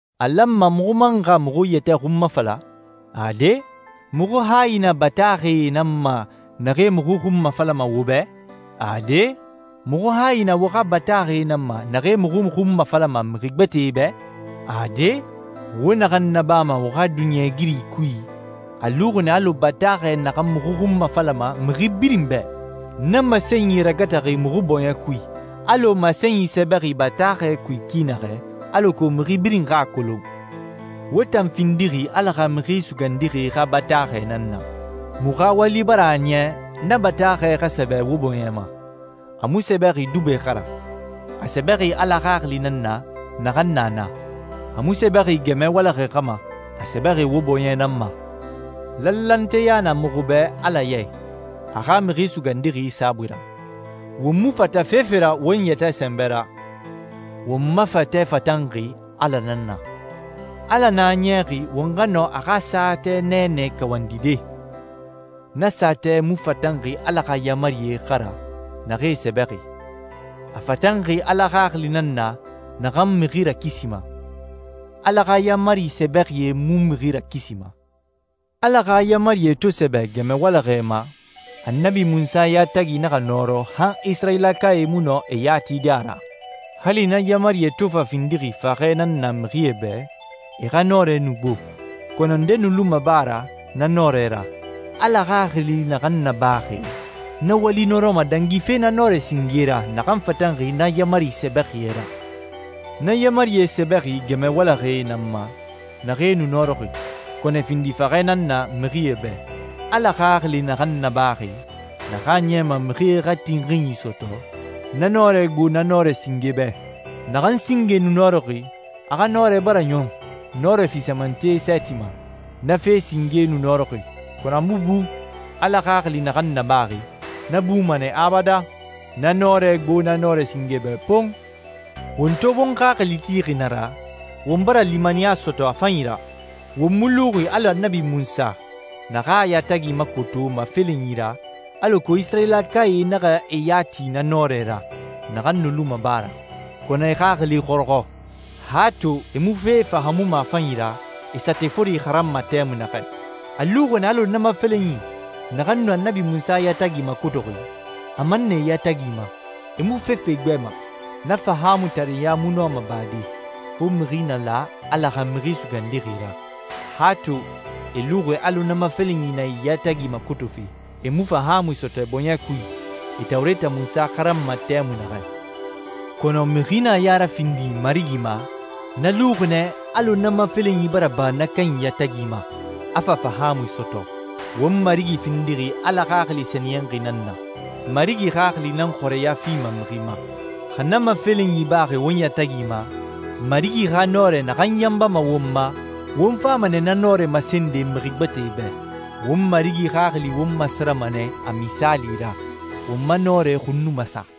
A lanma muxu man xa muxu yɛtɛ xunmafala? Ade. Muxu hayi na bataaxɛe nan ma naxee muxu xunmafalama wo bɛ? Ade. Muxu hayi na wo xa bataaxɛe nan ma naxee muxu xunmafalama mixi gbɛtɛe bɛ? Ade. Wo naxan nabama wo xa duniɲɛigiri kui a luxi nɛ alɔ bataaxɛ naxan muxu xunmafalama mixi birin bɛ. Na masenyi ragataxi muxu bɔɲɛ kui, alɔ masenyi sɛbɛxi bataaxɛ kui ki naxɛ alako mixi birin xa a kolon. Wo tan findixi Ala xa Mixi Sugandixi xa bataaxɛ nan na. Muxu xa wali bara a niya na bataaxɛ xa sɛbɛ wo bɔɲɛ ma. A mu sɛbɛxi dubɛ xa ra, a sɛbɛxi Ala Xaxili nan na, naxan na na. A mu sɛbɛxi gɛmɛ walaxɛ xa ma, a sɛbɛxi wo bɔɲɛ nan ma. Lanlanteya na muxu bɛ Ala ya i, a xa Mixi Sugandixi saabui ra. Won mu fata fefe ra won yɛtɛ sɛnbɛ ra. Won ma fatɛ fatanxi Ala nan na. Ala nan a niyaxi won xa nɔ a xa saatɛ nɛɛnɛ kawandide. Na saatɛ mu fatanxi Ala xa yaamarie xa ra naxee sɛbɛxi. A fatanxi Ala Xaxili nan na, naxan mixi rakisima. Ala xa yaamari sɛbɛxie mu mixi rakisima. Ala xa yaamarie to sɛbɛ gɛmɛ walaxɛe ma, Annabi Munsa yatagi naxa nɔrɔ han Isirayilakae mu nɔ e ya tide a ra. Hali na yaamarie to fa findixi faxɛ nan na mixie bɛ, e xa nɔrɛ nu gbo. Kɔnɔ nde nu luma ba ra na nɔrɛ ra. Ala Xaxili naxan nabaxi, na wali nɔrɔma dangife na nɔrɛ singe ra naxan fatanxi na yaamari sɛbɛxie ra. Na yaamarie sɛbɛxi gɛmɛ walaxɛe nan ma, naxee nu nɔrɔxi, kɔnɔ e findi faxɛ nan na mixie bɛ. Ala Xaxili naxan nabaxi, naxan a niyama mixie xa tinxinyi sɔtɔ, na nɔrɛ gbo na nɔrɛ singe bɛ. Naxan singe nu nɔrɔxi, a xa nɔrɛ bara ɲɔn nɔrɛ fisamante sɛɛti ma. Na fe singe nu nɔrɔxi, kɔnɔ a mu bu. Ala Xaxili naxan nabaxi, na buma nɛ abadan. Na nɔrɛ gbo na nɔrɛ singe bɛ pon! Won to won xaxili tixi na ra, won bara limaniya sɔtɔ a fanyi ra. Won mu luxi alɔ Annabi Munsa naxan a yatagi makoto mafelenyi ra alako Isirayilakae naxa e ya ti na nɔrɛ ra, naxan nu luma ba ra. Kɔnɔ e xaxili xɔrɔxɔ. Han to e mu fe fahaamuma a fanyi ra, e saatɛ fori xaranma tɛmui naxɛ. A luxi nɛ alɔ na mafelenyi, naxan nu Annabi Munsa yatagi makotoxi, a man na e yatagi ma, e mu fefe igbɛma. Na fahaamutareɲa mu nɔma bade, fo mixi na la Ala xa Mixi Sugandixi ra. Han to e luxi alɔ na mafelenyi na e yatagi makotofe, e mu fahaamui sɔtɔ e bɔɲɛ kui, e Tawureta Munsa xaranma tɛmui naxɛ. Kɔnɔ mixi na a ya rafindi Marigi ma, na luxi nɛ alɔ na mafelenyi bara ba na kanyi yatagi ma, a fa fahaamui sɔtɔ. Won Marigi findixi Ala Xaxili Sɛniyɛnxi nan na. Marigi Xaxili nan xɔrɛya fima mixi ma. Xa na mafelenyi baxi won yatagi ma, Marigi xa nɔrɛ naxan yanbama won ma, won fama nɛ na nɔrɛ masende mixi gbɛtɛe bɛ. Won Marigi Xaxili won masarama nɛ a misaali ra, won ma nɔrɛ xun nu masa.